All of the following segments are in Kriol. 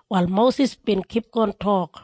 Wal Mosis bin kipgon tok,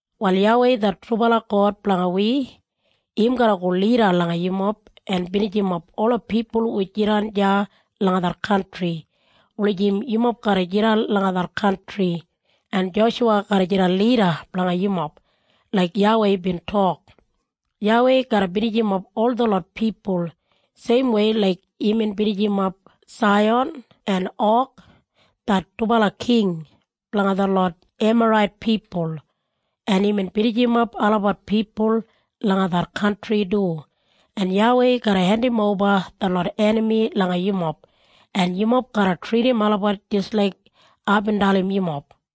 “Wal YAWEI det trubala God blanga wi, im garra go lida langa yumob en binijimap ola pipul hu jidan deya langa det kantri, wulijim yumob garra jidan langa det kantri, en Joshuwa garra jidan lida blanga yumob, laik YAWEI bin tok. YAWEI garra binijimap ol detlot pipul, seimwei laik imbin binijimap Saihan en Og, det dubala king blanga detlot Emarait pipul, en imbin binijimap olabat pipul langa det kantri du. En YAWEI garra hendimoba detlot enami langa yumob, en yumob garra tridim olabat jis laik aibin dalim yumob.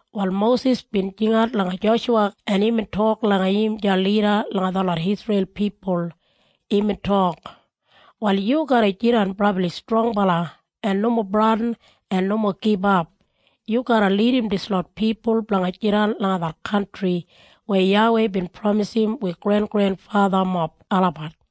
Wal Mosis bin jingat langa Joshuwa en imbin tok langa im deya lida langa detlot Isreil pipul. Imbin tok, “Wal yu garra jidan brabli strongbala en nomo bradin en nomo gibap. Yu garra lidim dislot pipul blanga jidan langa det kantri weya YAWEI bin pramisim wi grengrenfathamob olabat.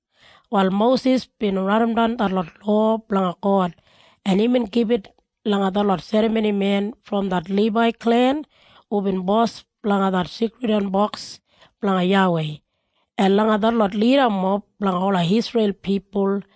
Wal Mosis bin raidimdan detlot lowa blanga God en imbin gibit langa detlot serramonimen brom det Libai klen hubin bos blanga det Seikridwan Boks blanga YAWEI, en langa detlot lidamob blanga ola Isreil pipul.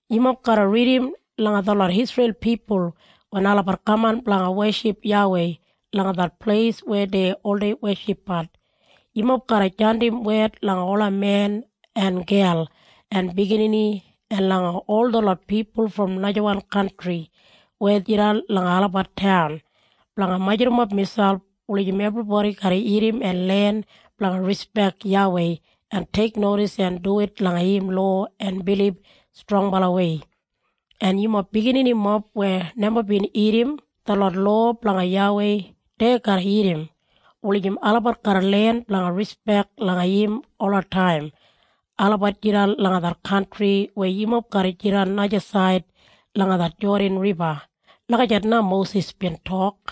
Yumob garra ridim langa detlot Isreil pipul wen olabat kaman blanga weship YAWEI langa det pleis weya dei oldei weshipbat. Yumob garra jandim wed langa ola men, en gel, en biginini, en langa ol detlot pipul brom najawan kantri weya jidan langa olabat taun, blanga majurrumap miselp wulijim ebribodi garra irrim en len blanga rispek YAWEI en teiknodis en duwit langa im lowa en bilib strongbalawei. En yumob bigininimob weya neba bin irrim detlot lowa blanga YAWEI, dei garra irrim, wulijim olabat garra len blanga rispek langa im olataim olabat jidan langa det kantri weya yumob garra jidan najasaid langa det Jodan Riba.” Lagijat na Mosis bin tok.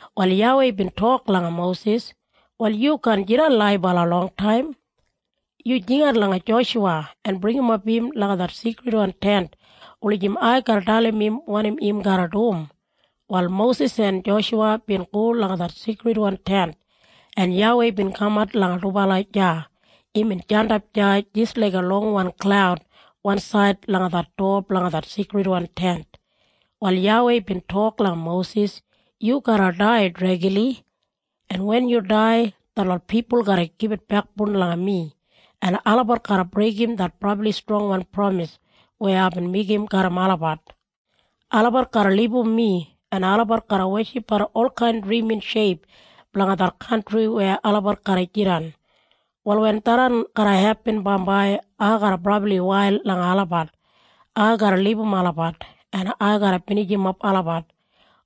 Wal YAWEI bin tok langa Mosis, “Wal yu kaan jidan laibala longtaim. Yu jingat langa Joshuwa en bringimap im langa det Seikridwan Tent wulijim ai garra dalim im wanim im garra dum.” Wal Mosis en Joshuwa bin go langa det Seikridwan Tent, en YAWEI bin kamat langa dubala deya. Imbin jandap deya jis laiga longwan klaud wansaid langa det dowa blanga det Seikridwan Tent. Wal YAWEI bin tok langa Mosis, “Yu garra dai dregli, en wen yu dai, detlot pipul garra gibit bekboun langa mi, en olabat garra breigim det brabli strongwan pramis weya aibin meigim garram olabat. Olabat garra libum mi, en olabat garra weshipbat olkain drimin sheip blanga det kantri weya olabat garra jidan. Wal wen tharran garra hepin bambai, ai garra brabli wail langa olabat. Ai garra libum olabat, en ai garra binijimap olabat.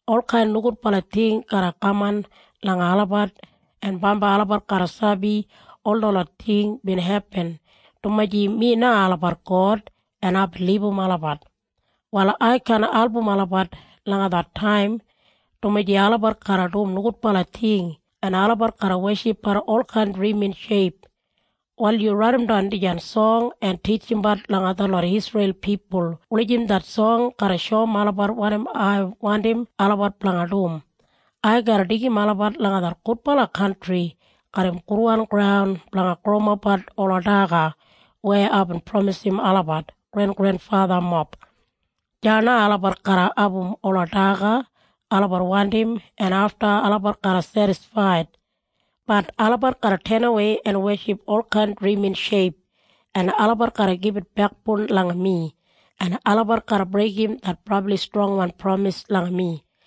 Olkain nogudbala ting garra kaman langa olabat en bambai olabat garra sabi ol detlot ting bin hepin dumaji mi na olabat God en aibin libum olabat. Wal ai kaan album olabat langa det taim, dumaji olabat garra dum nogudbala ting en olabat garra weshipbat olkain drimin sheip. “Wal yu raidimdan dijan song en titjimbat langa detlot Isreil pipul wulijim det song garra shoum olabat wanim ai wandim olabat blanga dum. Ai garra deigim olabat langa det gudbala kantri garram gudwan graun blanga growimapbat ola daga weya aibin pramisim olabat grengrenfathamob. Deya na olabat garra abum ola daga olabat wandim en afta olabat garra sedisfaid. Bat olabat garra tenawei en weship olkain drimin sheip, en olabat garra gibit bekboun langa mi, en olabat garra breigim det brabli strongwan pramis langa mi.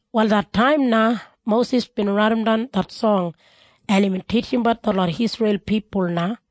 Wal det taim na, Mosis bin raidimdan det song en imbin titjimbat detlot Isreil pipul na.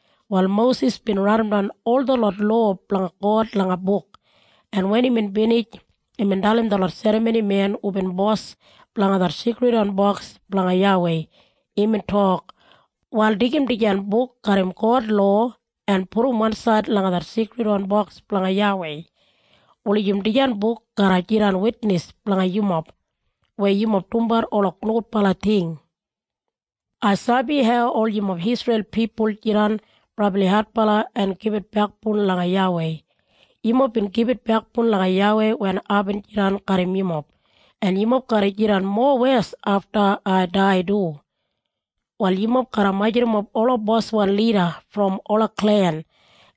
Wal Mosis bin raidimdan ol detlot lowa blanga God langa buk, en wen imbin binij, imbin dalim detlot serramonimen hubin bos blanga det Seikridwan Boks blanga YAWEI. Imbin tok, “Wal deigim dijan buk garram God lowa en pudum wansaid langa det Seikridwan Boks blanga YAWEI, wulijim dijan buk garra jidan witnis blanga yumob weya yumob dumbat ola nogudbala ting. Ai sabi hau ol yumob Isreil pipul jidan brabli adbala en gibit bekboun langa YAWEI. Yumob bin gibit bekboun langa YAWEI wen aibin jidan garram yumob, en yumob garra jidan mowes afta ai dai du. “Wal yumob garra majurrumap ola boswan lida brom ola klen,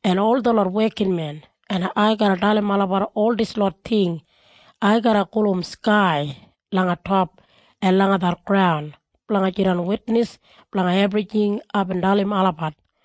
en ol detlot wekinmen, en ai garra dalim olabat ol dislot ting. Ai garra gulum skai langa top, en langa det graun, blanga jidan witnis blanga ebrijing aibin dalim olabat.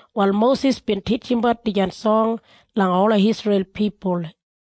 Wal Mosis bin titjimbat dijan song langa ola Isreil pipul.